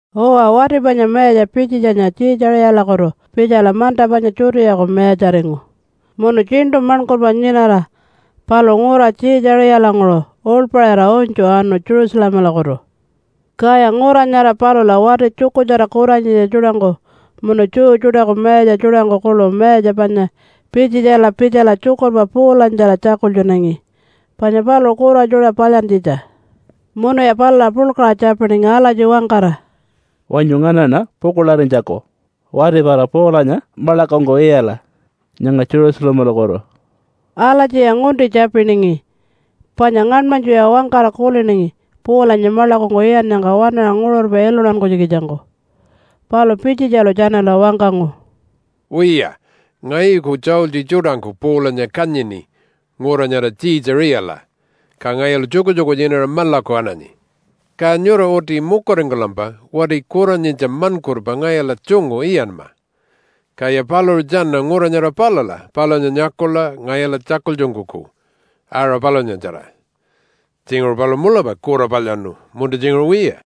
Uwa, wati panya mayatja Pitjitjanya Tjiitjaṟiyalakutu pitjala manta panya Judeaku mayatjaringu munu tjiṉṯu maṉkurpa nyinara paluṟu ngura Tjiitjaṟiyalanguṟu uḻpaṟira unytju anu Jerusalemalakutu. Kaya ngura nyara palula wati tjukurtjara kuranyitja tjuṯangku munu Jew tjuṯaku mayatja tjuṯangku kuḻu mayatja panya Pitjitjala pitjala tjukurpa Paulanyatjara tjakultjunangi panya paluṟu kura tjuṯa palyantjitja. Munuya palula puḻkaṟa tjapiningi alatji wangkara, “Wanyu nganaṉa pukuḻarinytjaku wati pala Paulanya maḻakungku iyala nyanga Jerusalemalakutu.” Alatjiya ngunti tjapiningi panya ngaṉmanytjuya wangkara kuliningi Paulanya maḻakungku iyannyangka waṉaṟa nguṟurpa iluntankunytjikitjangku. Palu Pitjitjalu tjanala wangkangu, “Wiya! Ngayuku tjaultji tjuṯangku Paulanya kanyini ngura nyara Tjiitjaṟiyala, ka ngayulu tjukutjuku nyinara maḻaku ananyi. Ka nyura uti mukuringkulampa wati kuranyitja maṉkurpa ngayula tjungu iyanma. Kaya paluṟu tjana ngura nyara palula palunya nyakula ngayula tjakultjunkuku aṟa palunyatjara. Tjinguṟu paluṟu mulapa kura palyaṉu, munta tjinguṟu wiya.”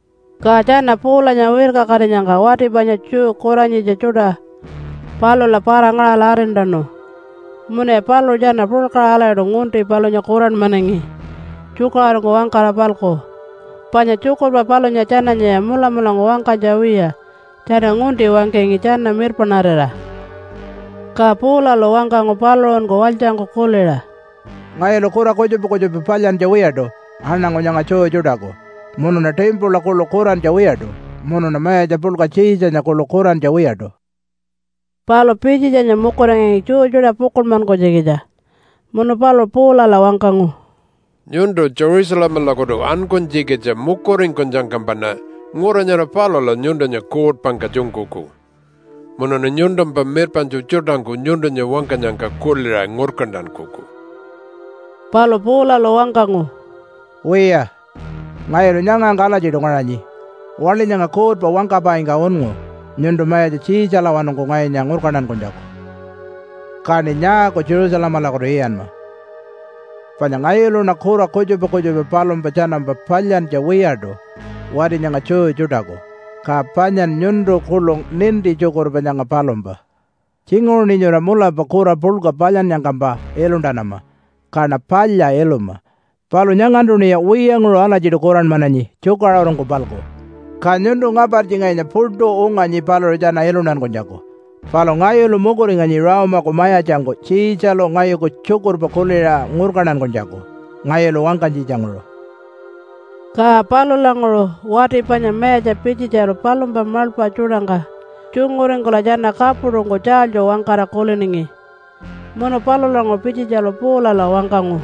Ka tjana Paulanya wirkakatinyangka wati panya Jew kuranyitja tjuṯa palula para-ngaṟala arintanu. Munuya paluṟu tjana puḻkaṟa alatjiṯu ngunti palunya kuranmanangi tjukaṟurungku wangkara-palku panya tjukurpa palunya tjananyaya mulamulangku wangkanytja wiya tjana ngunti wangkangi tjana mirpaṉarira. Ka Paulalu wangkangu paluṟunku walytjangku kuliṟa, “Ngayulu kura kutjupa kutjupa palyantja wiyaṯu aṉangu nyanga Jew tjuṯaku, munuṉa timpula kuḻu kurantja wiyaṯu, munuṉa mayatja puḻka Tjiitjanya kuḻu kurantja wiyaṯu.” Palu Pitjitjanya mukuringangi Jew tjuṯa pukuḻmankunytjikitja munu paluṟu Paulala wangkangu, “Nyuntu Jerusalemalakutu ankunytjikitja mukuringkunyangkampaṉa ngura nyara palula nyuntunya kuutpangka tjunkuku, munuṉa nyuntumpa mirpaṉtju tjuṯangku nyuntunya wangkanyangka kuliṟa ngurkantankuku.” Palu Paulalu wangkangu, “Wiya! Ngayulu nyangangka alatjiṯu ngaṟanyi waḻi nyanga kuutpa wangkapaingka unngu nyuntu mayatja Tjiitjalawanungku ngayunya ngurkantankunytjaku. Kaṉi nyaaku Jerusalemalakutu iyanma? Panya ngayuluṉa kura kutjupa kutjupa palumpa tjanampa palyantja wiyaṯu wati nyanga Jew tjuṯaku. Ka panyan nyuntu kuḻu ninti tjukurpa nyanga palumpa. Tjinguṟuṉi nyura mulapa kura puḻka palyannyangkampa iluntanama, kaṉa palya iluma. Palu nyangantuṉiya wiyanguṟu alatjiṯu kuranmananyi tjukaṟurungku-palku, ka nyuntu ngapartji ngayunya puṯu unganyi paluṟu tjana iluntankunytjaku. Palu ngayulu mukuringanyi Rome-aku mayatjangku Tjiitjalu ngayuku tjukurpa kuliṟa ngurkantankunytjaku ngayulu wangkanytjitjanguṟu.” Ka palulanguṟu wati panya mayatja Pitjitjalu palumpa maḻpa tjuṯangka tjunguringkula tjana kapuṯungku tjaalytju wangkara kuliningi. Munu palulanguṟu Pitjitjalu Paulala wangkangu,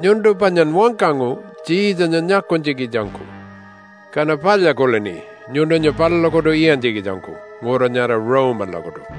“Nyuntu panyan wangkangu Tjiitjanya nyakunytjikitjangku, kaṉa palya kulini nyuntunya palulakutu iyantjikitjangku ngura nyara Rome-alakutu.”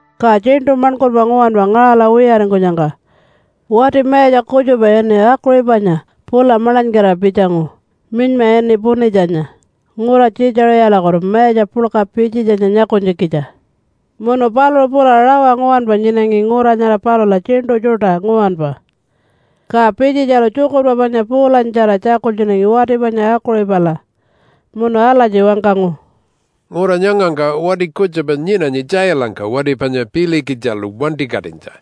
Ka tjiṉṯu maṉkurpa nguwanpa ngaṟala wiyaringkunyangka, wati mayatja kutjupa ini Akuṟipanya pula maḻanykira pitjangu, minyma ini Punitjanya, ngura Tjiitjaṟiyalakutu mayatja puḻka Pitjitjanya nyakunytjikitja. Munu paluṟu pula rawa nguwanpa nyinangi ngura nyara palula tjiṉṯu tjuṯa nguwanpa, ka Pitjitjalu tjukurpa panya Paulanyatjara tjakultjunangi wati panya Akuṟipala, munu alatji wangkangu, “Ngura nyangangka wati kutjupa nyinanyi tjailangka wati panya Pilikitjilu wantikatinytja.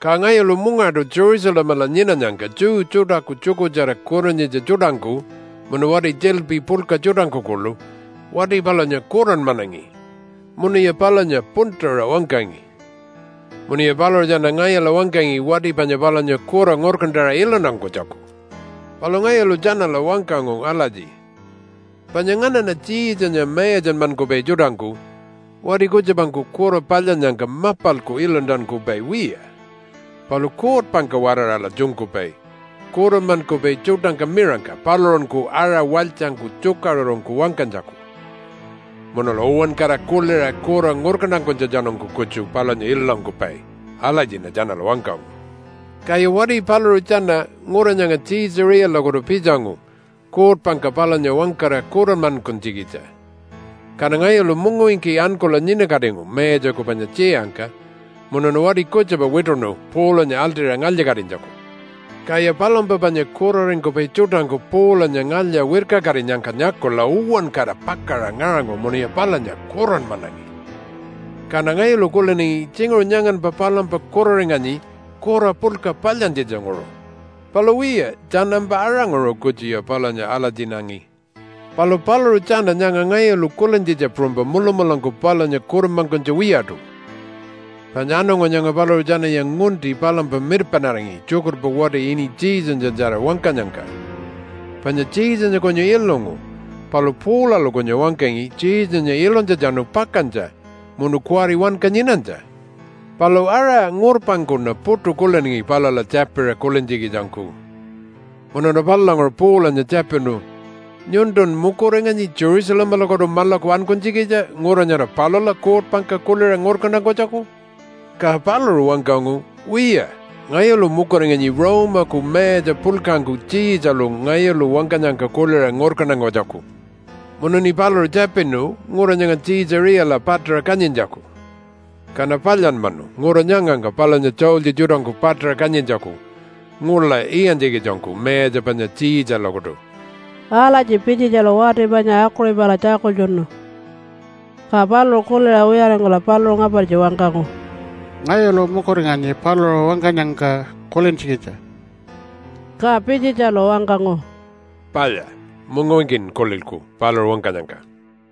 Ka ngayulu mungaṯu Jerusalemala nyinanyangka Jew tjuṯaku tjukurtjara kuranyitja tjuṯangku munu wati tjiḻpi puḻka tjuṯangku kuḻu wati palunya kuranmanangi munuya palunya puntuṟa wangkangi. Munuya paluṟu tjana ngayula wangkangi wati panya palunya kura ngurkantaṟa iluntankunytjaku. “Palu ngayulu tjanala wangkangu alatji, ‘Panya nganaṉa Tjiitjanya mayatjanmankupai tjuṯangku wati kutjupangku kura palyannyangka mapalku iluntankupai wiya, palu kuutpangka-waraṟala tjunkupai kuranmankupai tjuṯangka miṟangka paluṟunku aṟa walytjangku tjukaṟurungku wangkanytjaku. Munula uwankara kuliṟa kura ngurkantankunytjatjanungku kutju palunya iluntankupai.’ Alatjiṉa tjanala wangkangu. Kaya wati paluṟu tjana ngura nyanga Tjiitjaṟiyalakutu pitjangu kuutpangka palunya wangkara kuranmankunytjikitja. Kaṉa ngayulu mungawinki ankula nyinakatingu mayatjaku panya tjiyangka munuṉa wati kutjupa wituṉu Paulanya aḻṯira ngalya-katinytjaku. Kaya palumpa panya kuraringkupai tjuṯangku Paulanya ngalya-wirkakatinyangka nyakula uwankara pakaṟa ngaṟangu munuya palunya kuranmanangi. Kaṉa ngayulu kuliningi tjinguṟu nyanganpa palumpa kuraringanyi kura puḻka palyantjitjanguṟu, palu wiya tjanampa aṟanguṟu kutjuya palunya alatjinangi. Palu paluṟu tjana nyanga ngayulu kulintjitja puṟunypa mulamulangku palunya kuranmankunytja wiyaṯu. Panya aṉangu nyanga paluṟu tjanaya ngunti palumpa mirpaṉaringi tjukurpa wati ini Jesunyatjara wangkanyangka, panya Jesunya kunyu ilungu palu Paulalu kunyu wangkangi Jesunya ilunytjatjanu pakantja munu kuwari wanka nyinanytja. “Palu aṟa ngurpangkuṉa puṯu kuliningi palula tjapiṟa kulintjikitjangku. Munuṉa palulanguṟu Paulanya tjapinu, ‘Nyuntun mukuringanyi Jerusalemalakutu maḻaku ankunytjikitja ngura nyara palula kuutpangka kuliṟa ngurkantankunytjaku?’ Ka paluṟu wangkangu, ‘Wiya! Ngayulu mukuringanyi Rome-aku mayatja puḻkangku Tjiitjalu ngayulu wangkanyangka kuliṟa ngurkantankunytjaku.’ Munuṉi paluṟu tjapinu ngura nyanga Tjiitjaṟiyala paṯaṟa kanyintjaku. Kaṉa palyanmanu ngura nyangangka palunya tjaultji tjuṯangku paṯaṟa kanyintjaku ngula iyantjikitjangku mayatja panya Tjiitjalakutu.” Alatji Pitjitjalu wati panya Akuṟipala tjakultjunu. Ka paluṟu kuliṟa wiyaringkula paluṟu ngapartji wangkangu, “Ngayulu mukuringanyi paluṟu wangkanyangka kulintjikitja.” Ka Pitjitjalu wangkangu, “Palya, mungawinkin kulilku paluṟu wangkanyangka.”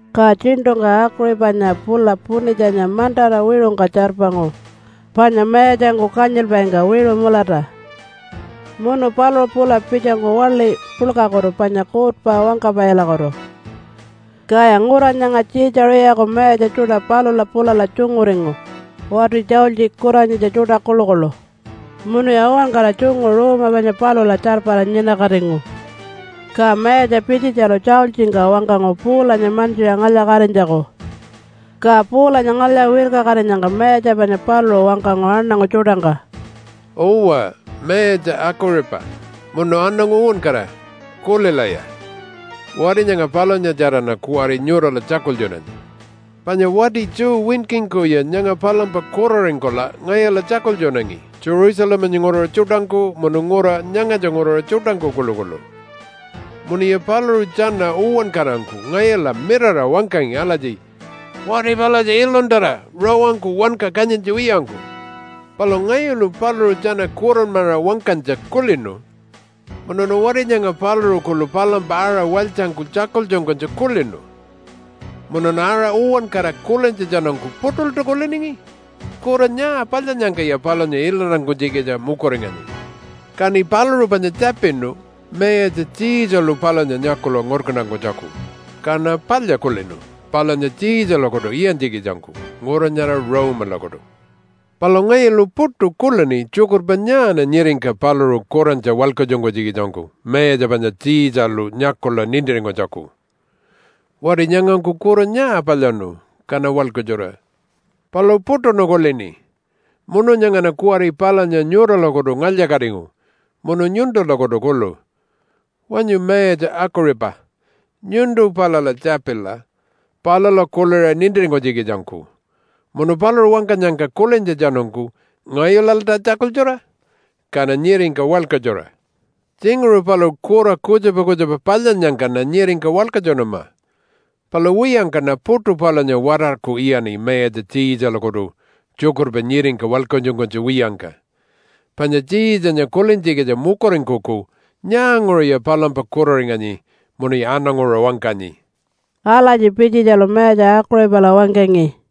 Ka tjiṉṯungka Akuṟipanya pula Punitjanya mantara wiṟungka tjarpangu panya mayatjangku kanyilpaingka wiṟu mulata, munu paluṟu pula pitjangu waḻi puḻkakutu panya kuutpa wangkapaikutu. Kaya ngura nyanga Tjiitjaṟiyaku mayatja tjuṯa palula pulala tjunguringu wati tjaultji kuranyitja tjuṯa kuḻukuḻu. Munuya uwankara tjungu ruuma panya palula tjarpara nyinakatingu. Ka mayatja Pitjitjalu tjaultjingka wangkangu Paulanya mantjiṟa ngalya-katinytjaku. Ka Paulanya ngalya-wirkakatinyangka mayatja panya paluṟu wangkangu aṉangu tjuṯangka, “Uwa, mayatja Akuṟipa munu aṉangu uwankara, kulilaya! Wati nyanga palunyatjaraṉa kuwari nyurala tjakultjunanyi. Panya wati Jew winkingkuya nyanga palumpa kuraringkula ngayula tjakultjunangi Jerusalemanya nguraṟa tjuṯangku munu ngura nyangatja nguraṟa tjuṯangku kuḻukuḻu. Munuya paluṟu tjana uwankarangku ngayula mirara wangkangi alatji, ‘Wati palatja iluntara rawangku wanka kanyintja wiyangku!’ Palu ngayulu paluṟu tjana kuranmaṟa wangkanytja kulinu munuṉa wati nyanga paluṟu kuḻu palumpa aṟa walytjangku tjakultjunkunytja kulinu. Munuṉa aṟa uwankara kulintjatjanungku puṯulta kuliningi, ‘Kura nyaa palyannyangkaya palunya iluntankunytjikitja mukuringanyi?’ Kaṉi paluṟu panya tjapinu mayatja Tjiitjalu palunya nyakula ngurkantankunytjaku, kaṉa palya kulini palunya Tjiitjalakutu iyantjikitjangku ngura nyara Rome-alakutu. Palu ngayulu puṯu kulini tjukurpa nyaaṉa nyiringka paluṟu kurantja walkatjunkunytjikitjangku mayatja panya Tjiitjalu nyakula nintiringkunytjaku? Wati nyangangku kura nyaa palyaṉu, kaṉa walkatjura? Palu puṯuṉa kulini. Munu nyangaṉa kuwari palunya nyuralakutu ngalya-katingu munu nyuntulakutu kuḻu. Wanyu Mayatja Akuṟipa, nyuntu palula tjapila palula kuliṟa nintiringkunytjikitjangku munu paluṟu wangkanyangka kulintjatjanungku ngayulalta tjakultjura, kaṉa nyiringka walkatjura. Tjinguṟu paluṟu kura kutjupa kutjupa palyannyangkaṉa nyiringka walkatjunama. Palu wiyangkaṉa puṯu palunya watarku iyaṉi mayatja Tjiitjalakutu tjukurpa nyiringka walkatjunkunytja wiyangka. Panya Tjiitjanya kulintjikitja mukuringkuku nyaanguṟuya palumpa kuraringanyi munuya aṉanguṟa wangkanyi.” Alatji Pitjitjalu mayatja Akuṟipala wangkangi.